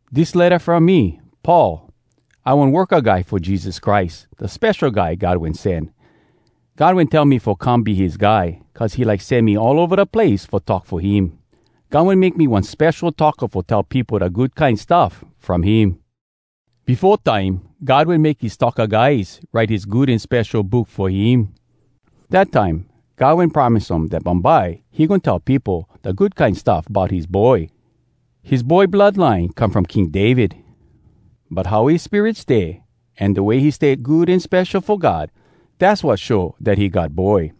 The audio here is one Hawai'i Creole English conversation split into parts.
Dis letta from me, Paul. I one worka guy fo Jesus Christ, da Spesho Guy God Wen Sen. God wen tell me fo come be his guy, cuz he like sen me all ova da place fo talk fo him. God wen make me one spesho talka fo tell peopo da Good Kine Stuff From Him. Befo time, God wen make his talka guys write his Good An Spesho Book fo him. Dat time, God wen promise um dat bumbye he goin tell peopo da Good Kine Stuff bout his Boy. His Boy blood line come from King David. But how his spirit stay, an da way he stay good an spesho fo God, dass wat show dat he God Boy.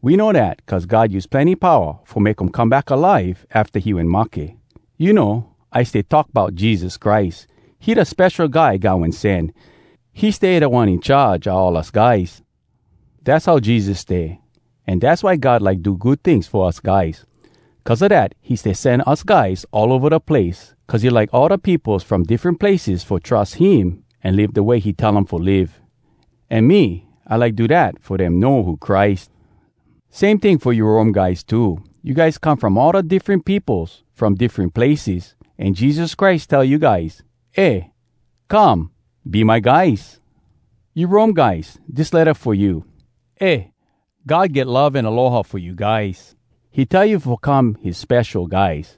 We know dat cuz God use plenny powa fo make um come back alive afta he wen mahke. You know, I stay talk bout Jesus Christ. He da Spesho Guy God Wen Sen. He stay Da One In Charge a all us guys. Dass how Jesus stay, an dass why God like do good tings fo us guys. Cuz a dat he stay sen us guys all ova da place, cuz he like all da peopos from diffren places fo trus him an live da way he tell um fo live. An me, I like do dat fo dem know who Christ. Same ting fo you Rome guys too. You guys come from all da diffren peopos from diffren places, an Jesus Christ tell you guys, “Eh come! Be my guys!” You Rome guys, dis letta fo you. Eh, God get love an aloha fo you guys. He tell you fo come his spesho guys.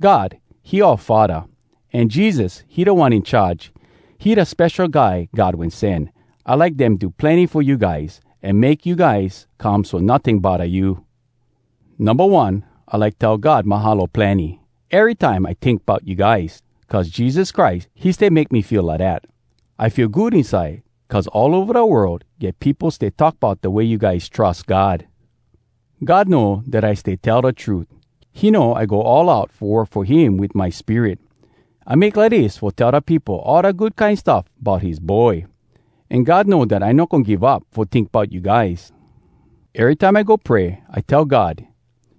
God, he oua faddah, an Jesus, he Da One In Charge, he da Spesho Guy God Wen Sen. I like dem do plenny fo you guys, an make you guys come so notting bodda you. Numba one, I like tell God “Mahalo plenny!” erytime I tink bout you guys, cuz Jesus Christ, he stay make me feel lidat. I feel good inside cuz all ova da world get peopo stay talk bout da way you guys trus God. God know dat I stay tell da trut. He know I go all out fo work fo him wit my spirit. I make lidis fo tell da peopo all da Good Kine Stuff Bout His Boy. An God know dat I no goin give up fo tink bout you guys. Erytime I go pray, I tell God: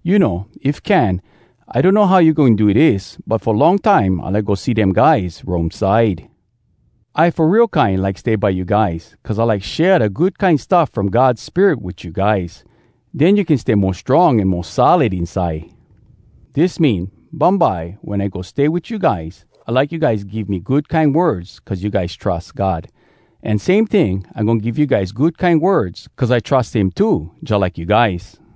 “You know, if can, I donno how you goin do dis, but fo long time I like go see dem guys Rome side.” I fo real kine like stay by you guys, cuz I like share da good kine stuff from God Spirit wit you guys. Den you can stay mo strong an mo solid inside. Dis mean, bumbye wen I go stay wit you guys, I like you guys give me good kine words cuz you guys trus God. An same ting, I goin give you guys good kine words cuz I trus him too jalike you guys.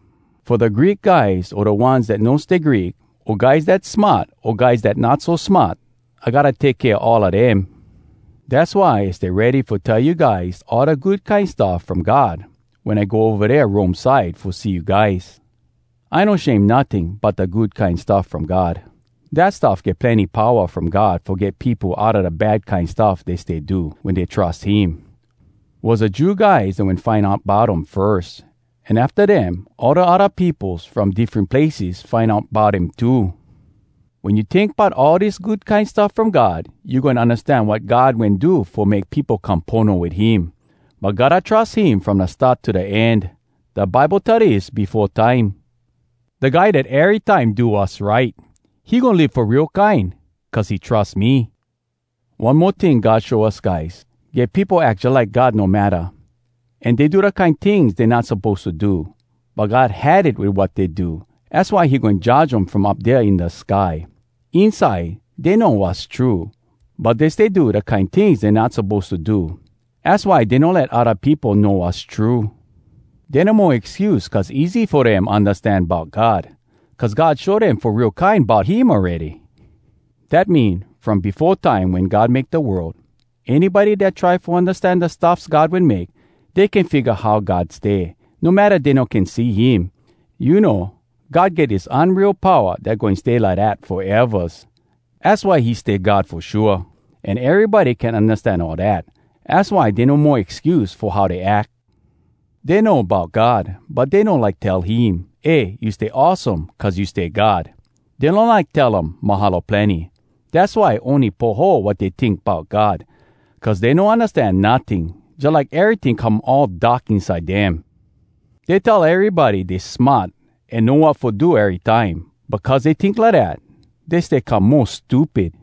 Fo da Greek guys o da ones dat no stay Greek, o guys dat smart o guys dat not so smart, I gotta take kea all a dem. Dass why I stay ready fo tell you guys all da Good Kine Stuff From God wen I go ova dea Rome side fo see you guys. I no shame notting bout da Good Kine Stuff From God. Dat stuff get plenny powa from God fo get peopo outa da bad kine stuff dey stay do, wen dey trus him. Was da Jew guys dat wen find out bout um firs, an afta dem, all da odda peopos from diffren places find out bout him too. Wen you tink bout all dis Good Kine Stuff From God, you goin undastan wat God wen do fo make peopo come pono wit him. But gotta trus him from da start to da end. Da Bible tell dis befo time: “Da guy dat erytime do wass right, He goin live fo real kine cuz he trus me.” One mo ting God show us guys: Get peopo ack jalike God no matta, an dey do da kine tings dey not suppose to do. But God had it wit wat dey do. Az why he goin judge um from up dea in da sky. Inside, dey know wass true, but dey stay do da kine tings dey not suppose to do. Az why dey no let odda peopo know wass true. Dey no mo excuse cuz easy fo dem undastan bout God. Cuz God show dem fo real kine bout him awready. Dat mean, from befo time wen God make da world, anybody dat try fo undastan da stuffs God wen make, dey can figga how God stay, no matta dey no can see him. You know, God get dis unreal powa dat goin stay lidat foevas. Az why he stay God fo shua. An erybody can undastan all dat. Az why dey no mo excuse fo how dey ack. Dey know bout God, but dey no like tell him, “Eh, you stay awesome cuz you stay God!” Dey no like tell um “Mahalo plenny!” Dass why ony poho wat dey tink bout God. Cuz dey no undastan notting, jalike eryting come all dark inside dem. Dey tell erybody dey smart an know wat fo do erytime. But cuz dey tink lidat, dey stay come mo stupid.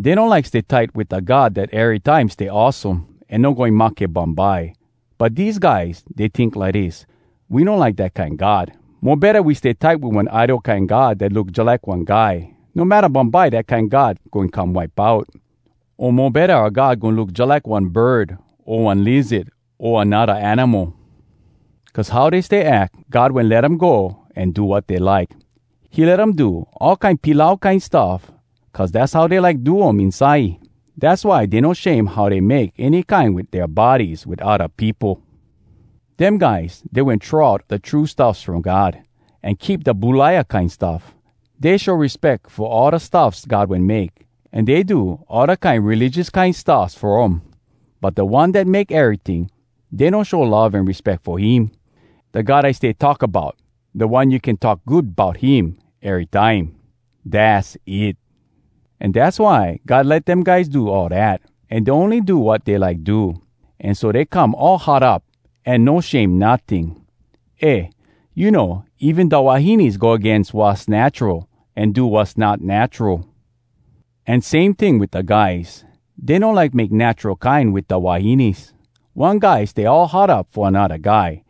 Dey no like stay tight wit da God dat erytime stay awesome an no goin mahke bumbye. But dese guys, dey tink lidis: “We no like dat kine God! Mo betta we stay tight wit one idol kine god dat look jalike one guy, no matta bumbye dat kine god goin come wipe out. O mo betta oua god goin look jalike one bird o one lizard o anodda animal.” Cuz how dey stay ack, God wen let um go an do wat dey like. He let um do all kine pilau kine stuff cuz dass how dey like do um inside. Dass why dey no shame how dey make any kine wit dea bodies wit odda peopo. Dem guys, dey wen throw out da true stuffs from God, an keep da bulaia kine stuff. Dey show respeck fo all da stuffs God wen make, an dey do all da kine religious king stuffs fo um. But da One dat make eryting, dey no show love an respeck fo him, da God I stay talk about. Da one you can talk good bout him erytime! Dass it! An dass why God let dem guys do all dat, an dey ony do wat dey like do. An so dey come all hot up, an no shame notting. Eh, you know, even da wahines go agains wass natural an do wass not natural. An same ting wit da guys. Dey no like make natural kine wit da wahines. One guy stay all hot up fo anodda guy.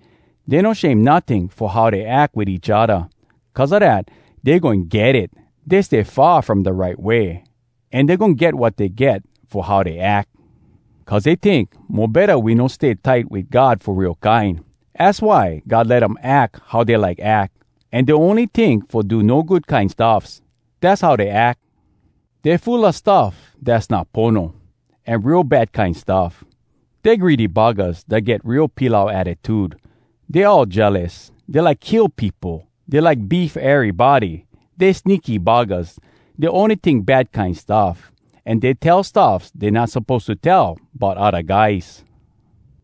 Dey no shame notting fo how dey ack wit each odda. Cuz a dat, dey goin get it! Dey stay far from da right way, an dey goin get wat dey get fo how dey ack. Cuz dey tink, “Mo betta we no stay tight wit God fo real kine!” Az why God let um ack how dey like ack. An dey ony tink fo do no good kine stuffs. Dass how dey ack. Dey full a stuff dass not pono, an real bad kine stuff. Dey greedy buggahs dat get real pilau attitude. Dey all jealous. Dey like kill peopo. Dey like beef erybody. Dey sneaky buggahs. Dey ony tink bad kine stuff. An dey tell stuffs dey not suppose to tell bout odda guys.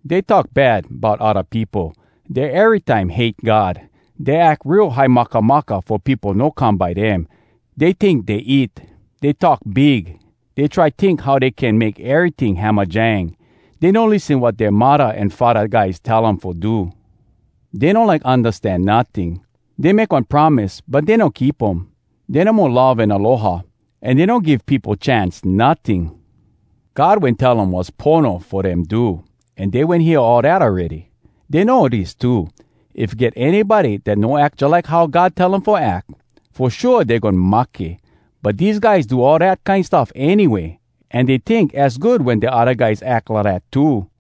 Dey talk bad bout odda peopo. Dey erytime hate God. Dey ack real high makamaka fo peopo no come by dem. Dey tink dey it. Dey talk big. Dey try tink how dey can make eryting hamajang. Dey no lissen wat dea muddah an faddah guys tell um fo do. Dey no like undastan notting. Dey make one promise but dey no keep um. Dey no mo love an aloha, an dey no give peopo chance notting. God wen tell um wass pono fo dem do, an dey wen hear all dat awready. Dey know dis too: if get anybody dat no ack jalike how God tell um fo ack, fo shua dey goin mahke. But dese guys do all dat kine stuff anyway, an dey tink az good wen da odda guys ack lidat too.